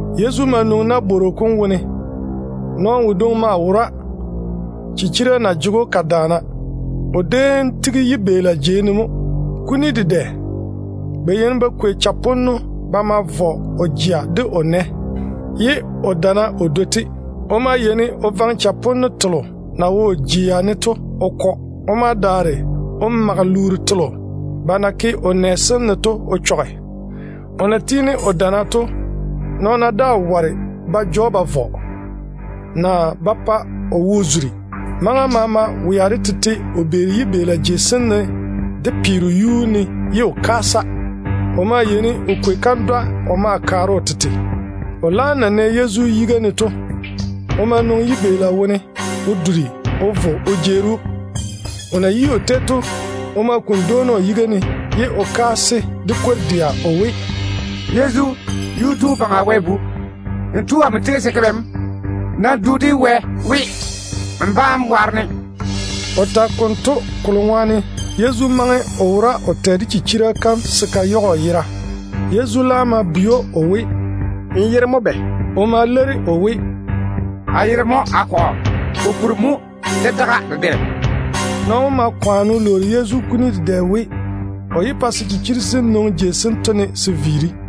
Yezu ma nwoŋi nabworo kom wone. Nɔɔno wodwoŋi maa wora chichira na jege‑o ka yaara. O déem tigi yibeela jei ne mo. Kuni dedɛ ba yeini ba kwei chaponno ba ma vɔ o jea de o nɛ, ye o damma o dwoi-te. O maa yeini o vaŋe chaponno telo na wo o jea ne to o kɔ. O ma daare o mage luuru telo ba na ke o nɛ sem ne to o chɔge. O na tiini o damma to, nɔɔna daa ware ba ja‑o ba vɔ, naa ba pa o wo zuri. Maŋa maama wea de tete o beeri yibeela jei sem ne de peero yuu ne ye o kaasa. O maa yeini o kwei kandwa o ma kaare o tete. O na zege yiga yiga o tole o na Yezu to, o ma duri o vo o jeeri‑o. O na yi o tei to, o ma kuni dwoona o yiga ne, ye o kaase de kwor-dɛa o we, “Yezu, Yuu-tu Baŋa Wɛ wom Bu, n tu amo tei se n ke bɛ mo? Nam du de Wɛ we n bá‑n waare-ne.” O tage konto kolo ŋwaane Yezu maŋe o wora o tɛ de chichira kam se ka yage o yera. Yezu laam ma bwei‑o o we, “N yere mo bɛ?” O ma leiri o we, “A yere mo Akɔgɔ, kokuri mo debam daga dedɛ.” Nɔɔno wom ma kwaane o lwoori Yezu kuni dedɛ we, o yé pa se chichiri sem nwoŋi jei sento ne se viiri.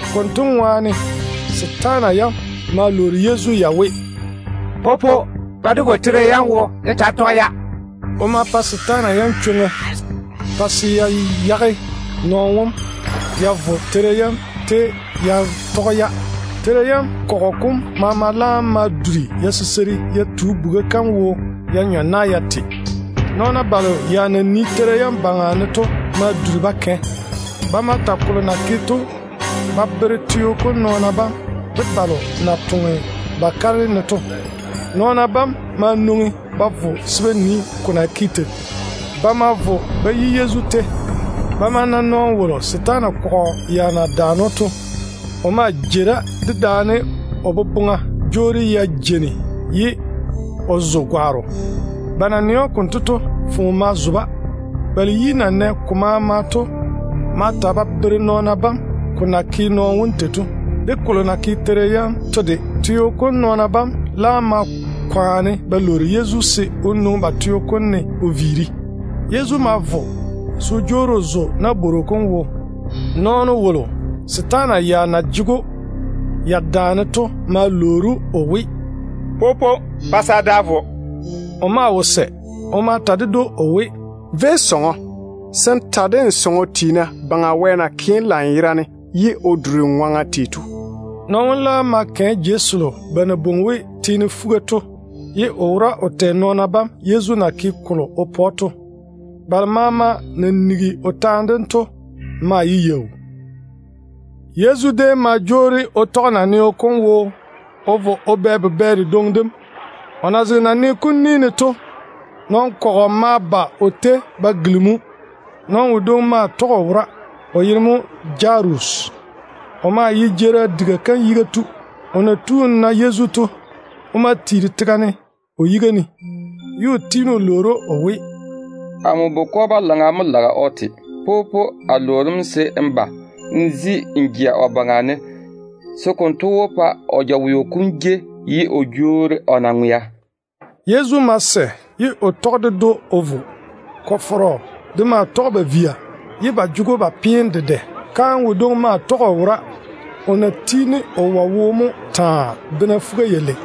Konto ŋwaane setaana yam ma lwoori Yezu ya we, “Popo, pa dé vo teira yam wo dé taa tɔge-ya.” O ma pa setaana yam chwoŋa pa ya yage nɔɔno wom ye ya vo ya tɔge teira yam. Teira yam kɔgɔ kom maama laam ma duri ya siseiri ya tu buga kam wo ya nyɔ na ya te. Nɔɔna balo ya na nii teira yam baŋa ne to ma duri ba vo ba ta kolo na ke to ba bere teo kom nɔɔna bam de balo na wo ba kare ne ba toŋe to. Nɔɔna bam ma nwoŋi ba vo se ba nii ko na ke tei. Ba ma vo ba yi Yezu tei. Ba ma na nɔɔno wolo setaana kɔgɔ kom ya na daane‑o to. O maa jei da dedaane o boboŋa jwoori ya jeini ye o zo gwaaro. Ba na nɛ‑o konto to, foone ma zo-ba. Balo yi na nɛ ko maama to ma ta ba bere nɔɔna bam ko na ke nɔɔno wom tei to, de kolo na ke teira yam to de. Teo kom nɔɔna bam laam ma kwaane ba lwoori Yezu se o nwoŋi ba teo kom ne o viiri. Yezu ma vo se o jwoori o zo nabworo kom wo. Nɔɔno wolo setaana yam ya na jege‑o ya daane to ma lwoori‑o o we, “Popo, pa se a da a vo.” O maa wo sɛ ye o ta ded‑o o we, “Véi sɔŋɔ se n ta de n sɔŋɔ tiina Baŋa Wɛ na ke‑m lanyerane ye o duri nmo ŋwaŋa tei to.” Nɔɔno wom laam ma kɛ jei selo ba na bwoŋi we ‘Teene Fuga’ to ye o wora o tɛ nɔɔna bam Yezu na ke kolo o pa‑o to. Balo maama na nigi o taane dem to maa ye yaau. Yezu déem ma jwoori o tɔge naneo kom wo o vo o bɛ bubɛ dedwoŋi dem. O na zege naneo kom ni ne to, nɔn-kɔgɔ ma ba o tei ba gilimi‑o. Nɔɔno wodwoŋi maa tɔge o wora, o yere mo Jarusi. Wonto ye Juu tiina jeerim diga kam yiga tu mo. O na tu o na Yezu to, o ma tiiri tega ne o yiga ne. O ma tiini o lwoori‑o o we, “Amo bukɔ-balaŋa mo lage o te. Popo, a lwoori‑m se n ba n zi n jea o baŋa ne, se konto wó pa o jaweo kom jei ye o jwoori o na ŋwea.” Yezu ma sɛ ye o tɔge ded‑o o vo. Kɔ-fɔrɔ de maa tɔge ba via ye ba jege‑o ba peene dedɛ. Kaane wodwoŋi maa tɔge o wora, o na tiini o wɔe wo taa, bena fuga-yalei.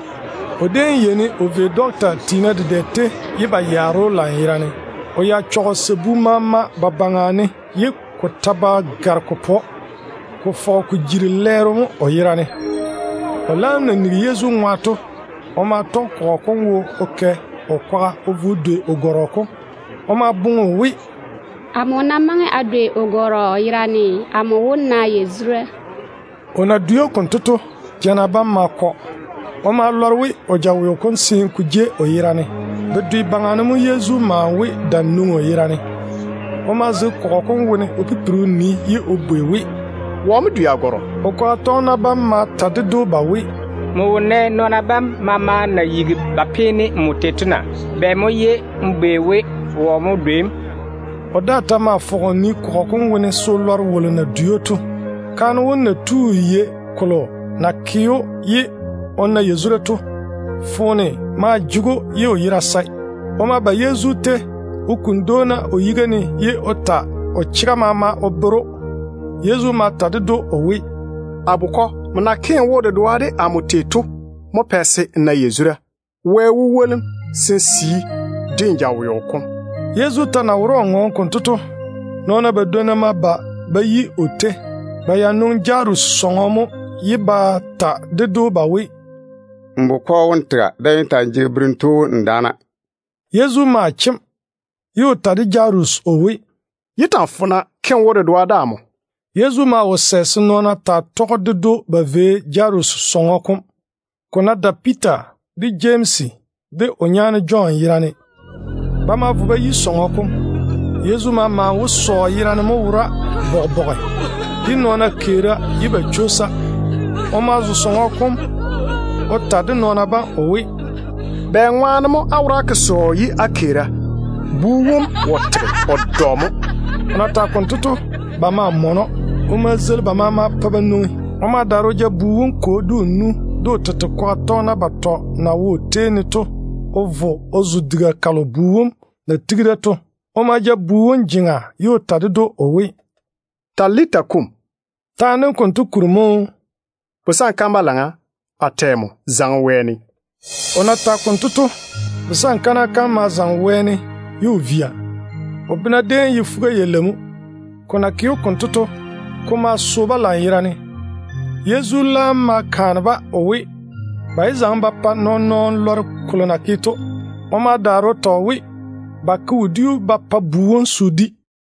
O déem yeini o vei dɔkta tiina dedɛ tei ye ba yaare‑o lanyerane. O ya chɔge o sabu maama ba baŋa ne ye ko ta ba gare ko pa‑o, ko fɔge ko jiri lɛɛro mo o yera ne. O laam na nigi Yezu ŋwa to, o ma tɔge kɔgɔ kom wo o kɛ o kwaga o vo o dwei o gɔrɔ kom. O maa boŋe we, “Amo ná maŋe a dwei o gɔrɔ yerane, amo wó na yazura.” O na dwei Yezu konto to, jana bam ma kɔ. O ma lɔre we o jaweo kom seene ko jei o yera ne. Bedwe baŋa ne mo Yezu maane we dam nwoŋi o yera ne. O ma zege kɔgɔ kom wone o pipiri o nii ye o bwei we, “Wɔ mo dwei a gɔrɔ?” O kwaga tɔgena bam ma ta ded‑o ba we, “N wo nɛ nɔɔna bam maama na yigi ba peene nmo tei to na? Bɛ mo ye n bwei we, wɔ mo dwei‑m?” O daa ta ma fɔge o nii kɔgɔ kom wone se o lɔre wolo na dwei‑o to. Kaane wom na lɔre kolo na ke‑o ye o na yazura to, foone maa jege‑o ye o yera sae. O ma vo Yezu tei o kuni dwoona o yiga ne ye o ta o chega maama o bere‑o. Yezu ma ta ded‑o o we, “A bukɔ, nmo na ke n wo-dedoa de amo tei to mo pɛ se n na yazura. Wɛ wó woli‑m se n sii de n jaweo kom.” Yezu ta na wora o ŋɔɔne konto to, nɔɔna badwonna ma ba ba yi o tei. Ba ya nwoŋi Jarusi sɔŋɔ mo ye ba ta ded‑o ba we, “N bukɔ wom tega. Daa‑n yé ta‑n jege berem tu wom n daana.” Yezu ma chem, ye o ta de Jarusi o we, “Yé ta‑n fona. Nam yɔɔre n ke n wo-dedoa de Wɛ.” Yezu maa wo sɛ se nɔɔna tɔge ded‑o ba vo Jarusi sɔŋɔ kom, ko ná dae Piita, de Jemsi, de o nyaane Jɔn yerane. Ba ma vo ba yi sɔŋɔ kom. Yezu ma maane we sɔɔ yerane mo wora bɔge-bɔge, ye nɔɔna keera ye ba chwoosa. O ma zo sɔŋɔ kom o ta de nɔɔna bam o we, “Bɛŋwaane mo á wora á ke sɔɔ ye á keera? Bu wom wo tege, o dɔ mo.” O na tage konto to, ba ma mɔne‑o. O ma zeili ba maama pa ba nwoŋi. O ma daare o ja bu wom kwo, de o nu, de o tete kwaga tɔgena batɔ na wo o tei ne to o vo o zo diga kalo bu wom na tigi da to. O ma ja bu wom jeŋa ye o ta ded‑o o we, “Talita, koum.” Taane dento kuri mo ye “Busankana balaŋa, a tɛ nmo, zaŋe wɛɛne.” O na tage konto to, busankana kam ma zaŋe wɛɛne ka via. O bena déem ye fuga-yalei mo. Ko na ke‑o konto to, ko ma so-ba lanyerane. Yezu laam ma kaane-ba o we, ba yé zaŋe ba pa nɔɔn-nɔɔno lɔre kolo na ke to. O ma daare o ta o we, ba ke wodiu ba pa bu wom se o di.